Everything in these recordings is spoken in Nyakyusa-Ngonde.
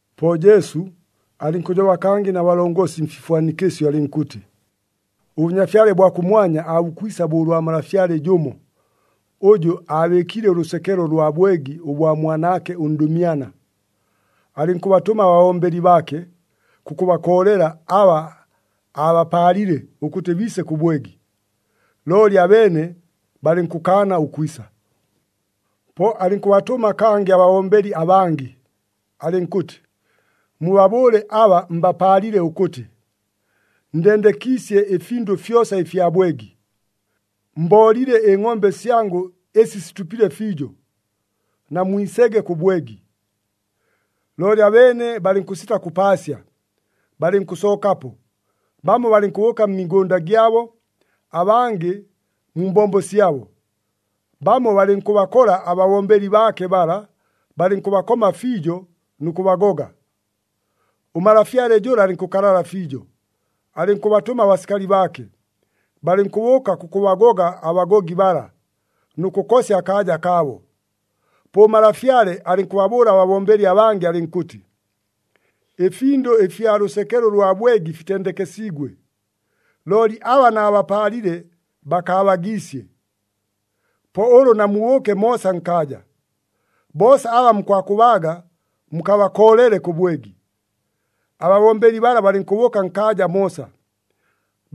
Po Jesu, alɨnkʉjoba kangɨ na balongosi mfifwanikɨsyo alɨnkʉtɨ, “ɄBʉnyafyale bwa kʉmwanya aabukwisa bo ʉlwa malafyale jʉmo, ʉjʉ aabɨɨkile ʉlʉsekelo lwa bwegi ʉbwa mwanaake ʉndʉmyana. Alɨnkʉbatʉma ababombeli baake, kʉkʉbakoolela aba aabapaalile ʉkʉtɨ biise kʉ bwegi, looli abeene balɨnkʉkaana ʉkwisa. “Po alɨnkʉbatʉma kangɨ ababombeli abangɨ, alɨnkʉtɨ, ‘Mubabʉʉle aba mbapaalile ʉkʉtɨ, “Ndendekiisye ɨfindʉ fyosa ɨfya bwegi. Mboolile ɨngʼombe syangʉ ɨsi situpile fiijo, namwisege kʉ bwegi!” ’ Looli abeene balɨnkʉsita kʉpaasya. Balɨnkʉsookapo, bamo balɨnkʉbʉʉka mmigʉnda gyabo, abangɨ mu mbombo syabo. Bamo balɨnkʉbakola ababombeli baake bala, balɨnkʉbakoma fiijo nʉ kʉbagoga. Ʉmalafyale jʉla alɨnkʉkalala fiijo, alɨnkʉbatʉma abasikali baake, balɨnkʉbʉʉka kʉkʉbagoga abagogi bala, nʉ kʉkosya akaaja kaabo. Po ʉmalafyale alɨnkʉbabʉʉla ababombeli abangɨ alɨnkʉtɨ, ‘Ɨfindʉ ɨfya lʉsekelo ʉlwa bwegi fitendekesiigwe, looli aba naabapaalile bakaabagiisye. Po ʉlʉ namubʉʉke moosa nkaaja, boosa aba mukwakʉbaaga mukabakoolele kʉ bwegi.’ Ababombeli bala balɨnkʉbʉʉka nkaaja moosa.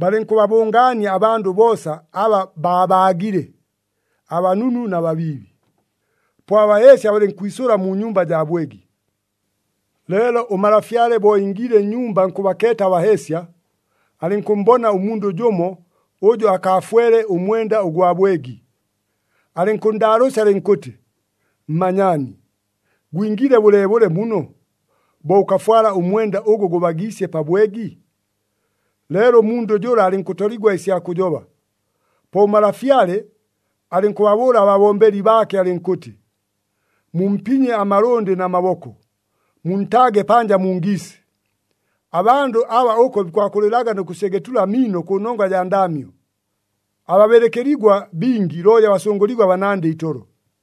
Balɨnkʉbabʉngaania abandʉ boosa aba babaagile, abanunu na babiibi. Po abaheesya balɨnkwisʉla mu nyumba jaa bwegi. “Leelo ʉmalafyale bo ingiile nnyumba nkʉbakeeta abaheesya, alɨnkʉmmbona ʉmundʉ jʉmo ʉjʉ akaafwele ʉmwenda ʉgwa bwegi. Alɨnkʉnndaalʉʉsya alɨnkʉtɨ, ‘Mmanyaani, gwingiile bʉleebʉle muno, bo ʉkafwala ʉmwenda ʉgʉ gʉbagiisye pa bwegi?’ Leelo ʉmundʉ jʉla alɨnkʉtoligwa ɨsya kʉjoba. Po ʉmalafyale alɨnkʉbabʉʉla ababombeli baake alɨnkʉtɨ, ‘Mumpinye amalʉndɨ na maboko, muntaage panja mu ngiisi. Abandʉ aba ʉko bikwakʉlɨlaga nʉ kʉsyegetula amiino kʉnongwa jaa ndaamyo.’ Ababɨlɨkɨligwa bingi, looli abasʉngʉligwa banandɨ itolo.”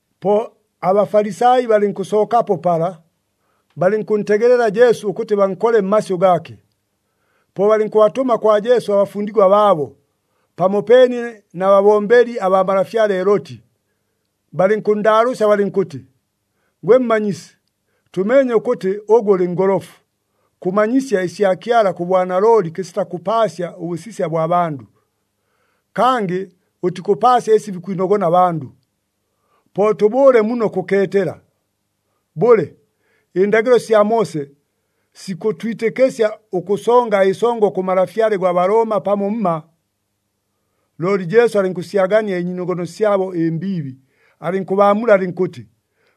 Po aBafalisai balɨnkʉsookapo pala, balɨnkʉntegelela Jesu ʉkʉtɨ bankole mmasyʉ gaake. Po balɨnkʉbatʉma kwa Jesu abafundigwa baabo, pamopeene na babombeli abaa malafyale Heloti, balɨnkʉnndaalʉʉsya balɨnkʉtɨ, “Gwe Mmanyisi, tʉmeenye ʉkʉtɨ ʉgwe ʉlɨ ngolofu, kʉmanyisya ɨsya Kyala kʉ bwanalooli kɨsita kʉpaasya ʉbʉsisya bwa bandʉ. Kangɨ ʉtikʉpaasya ɨsi bikwinogona abandʉ. Po tʉbʉʉle muno kʉkeetela. Bʉle, ɨndagɨlo sya Moose sikʉtwitɨkɨsya ʉkʉsonga ɨsongo kʉ malafyale gwa Balooma pamo mma?” Looli Jesu alɨnkʉsyagania ɨnyiinogono syabo ɨmbiibi, alɨnkʉbaamula alɨnkʉtɨ,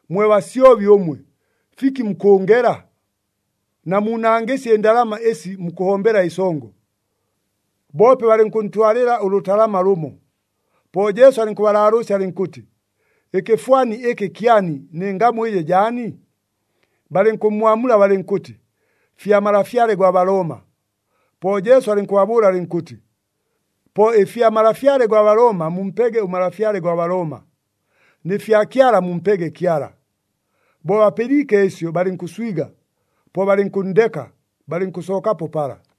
“Mwe basyobi ʉmwe, fiki mukʉʉngela? Namuunangɨsye ɨndalama ɨsi mukʉhombela ɨsongo.” Boope balɨnkʉntwalɨla ʉlʉtalama lʉmo. Po Jesu alɨnkʉbalaalʉʉsya alɨnkʉtɨ, “Ɨkɨfwani ɨkɨ kyani, nɨ ngamu ɨjɨ jaani?” Balɨnkʉmmwamula balɨnkʉtɨ, “Fya malafyale gwa Balooma.” Po Jesu alɨnkʉbabʉʉla alɨnkʉtɨ, “Po ɨfya malafyale gwa Balooma mumpege ʉmalafyale gwa Balooma, nɨ fya Kyala mumpege Kyala.” Bo bapɨliike ɨsyo, balɨnkʉswiga, po balɨnkʉnndeka, balɨnkʉsookapo pala.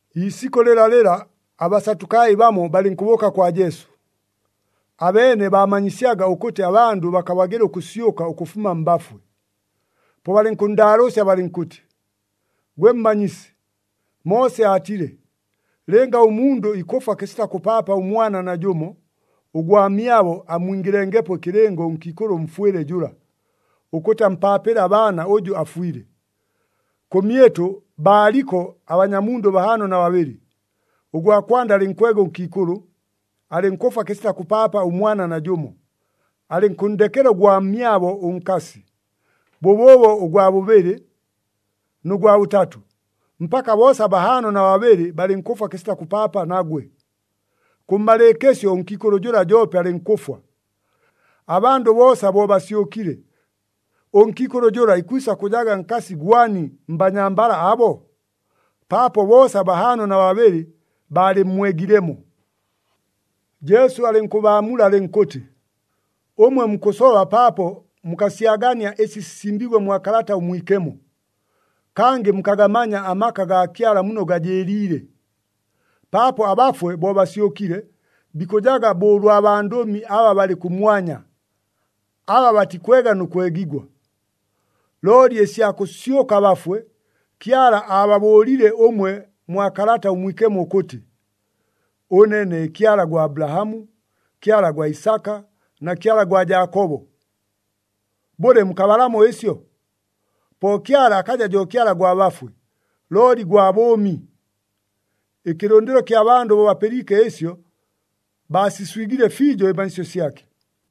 Iisikʉ lɨlalɨla, aBasatukai bamo balɨnkʉbʉʉka kwa Jesu. Abeene baamanyisyaga ʉkʉtɨ abandʉ bakabagɨla ʉkʉsyʉka ʉkʉfuma mbafwe. Po balɨnkʉnndaalʉʉsya balɨnkʉtɨ, “Gwe Mmanyisi, Moose aatile, ‘Lɨnga ʉmundʉ ikʉfwa kɨsita kʉpaapa ʉmwana najʉmo, ʉgwamyabo ammwingɨlengepo ɨkɨlɨngo ʉnkiikʉlʉ ʉmfwɨle jʉla, ʉkʉtɨ ampaapɨle abaana ʉjʉ afwile.’ Kʉmyɨtʉ, baaliko abanyamundʉ bahaano na babɨlɨ. Ʉgwa kwanda alɨnkwega ʉnkiikʉlʉ, alɨnkʉfwa kɨsita kʉpaapa ʉmwana najʉmo. Alɨnkʉnndekela ʉgwamyabo ʉnkasi. Bʉbʉʉbo ʉgwa bʉbɨlɨ, nʉ gwa bʉtatʉ, mpaka boosa bahaano na babɨlɨ balɨnkʉfwa kɨsita kʉpaapa nagwe. Kʉmmalɨɨkɨsyo ʉnkiikʉlʉ jʉla joope alɨnkʉfwa. Abandʉ boosa bo basyʉkile, ʉnkiikʉlʉ jʉla ikwisa kʉjaga nkasi gwani mbanyambala abo? Paapo boosa bahaano na babɨlɨ baalɨmmwegilemo!” Jesu alɨnkʉbaamula alɨnkʉtɨ, “Ʉmwe mukʉsoba paapo mukasyagania ɨsi sisimbiigwe mwa Kalata ʉMwikemo, kangɨ mukagamanya amaka gaa Kyala muno gajɨɨliile. Paapo abafwe bo basyʉkile, bikʉjaga bo ʉlwa bandʉmi aba balɨ kʉmwanya, aba batikwega nʉ kwegigwa. Looli ɨsya kʉsyʉka abafwe, Kyala aababʉʉlile ʉmwe mwa Kalata ʉMwikemo ʉkʉtɨ, ‘Ʉne ne Kyala gwa Abulahamu, Kyala gwa Isaka na Kyala gwa Jaakobo.’ Bʉle, mukabalamo ɨsyo? Po Kyala akaja jo Kyala gwa bafwe, looli gwa bʉʉmi!” Ɨkɨlʉndɨlo ɨkya bandʉ bo bapɨliike ɨsyo, baasiswigile fiijo ɨmanyisyo syake.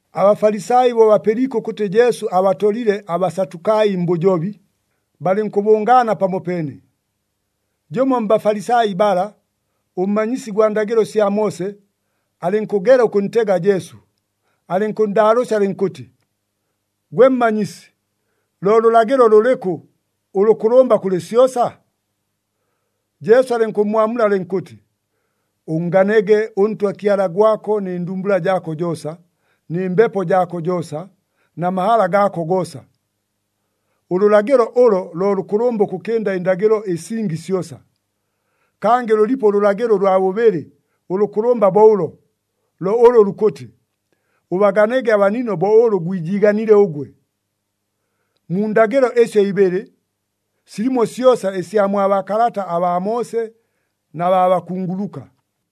ABafalisai bo bapɨliike ʉkʉtɨ Jesu abatolile aBasatukai mbʉjobi, balɨnkʉbʉngaana pamopeene. Jʉmo mBafalisai bala, ʉmmanyisi gwa ndagɨlo sya Moose, alɨnkʉgela ʉkʉntega Jesu, alɨnkʉnndaalʉʉsya alɨnkʉtɨ, “Gwe Mmanyisi, lo lʉlagɨlo lʉlɨkʉ ʉlʉkʉlʉmba kʉlɨ syosa?” Jesu alɨnkʉmmwamula alɨnkʉtɨ, “Ʉnnganege ʉNtwa Kyala gwako nɨ ndumbula jaako joosa, nɨ mbepo jaako joosa, na mahala gaako goosa. Ʉlʉlagɨlo ʉlo, lo lʉkʉlʉmba ʉkʉkɨnda ɨndagɨlo ɨsingi syosa. Kangɨ lʉlipo ʉlʉlagɨlo ʉlwa bʉbɨlɨ ʉlʉkʉlʉmba bo ʉlo, lo ʉlʉ lukʉtɨ, ‘Ʉbaganege abanino bo ʉlʉ gwijiiganile ʉgwe.’ Mu ndagɨlo ɨsyo ibɨlɨ, silimo syosa ɨsya mwa baakalata abaa Moose na baa bakunguluka.”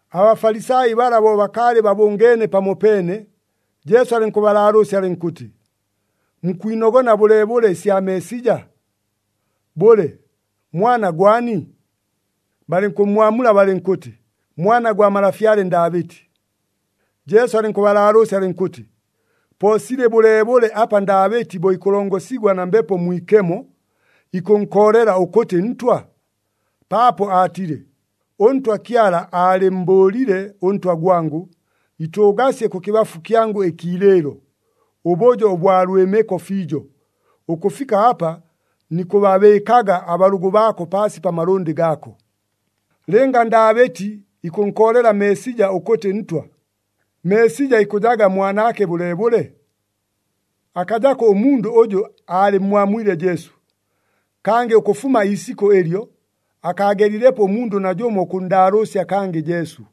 ABafalisai bala bo bakaalɨ babʉngeene pamopeene, Jesu alɨnkʉbalaalʉʉsya alɨnkʉtɨ, “Mukwinogona bʉleebʉle ɨsya Meesija? Bʉle, mwana gwani?” Balɨnkʉmmwamula balɨnkʉtɨ, “Mwana gwa malafyale Ndaabɨti.” Jesu alɨnkʉbalaalʉʉsya alɨnkʉtɨ, “Po silɨ bʉleebʉle apa Ndaabɨti bo ikʉlongosigwa na Mbepo Mwikemo, ikʉnkoolela ʉkʉtɨ Ntwa? Paapo aatile, ‘ɄNtwa Kyala aalɨmmbʉʉlile ʉNtwa gwangʉ, “Itʉʉgasye kʉkɨbafu kyangʉ ɨkiilɨɨlo, ʉbʉjo ʉbwa lwɨmɨko fiijo, ʉkʉfika apa nikʉbabɨɨkaga abalʉgʉ baako paasi pa malʉndɨ gaako.” ’ “Lɨnga Ndaabɨti ikʉnkoolela Meesija ʉkʉtɨ Ntwa, Meesija ikʉjaga mwanaake bʉleebʉle?” Akajako ʉmundʉ ʉjʉ aalɨmmwamwile Jesu. Kangɨ ʉkʉfuma iisikʉ ɨlyo, akaagelilepo ʉmundʉ najʉmo ʉkʉnndaalʉʉsya kangɨ Jesu.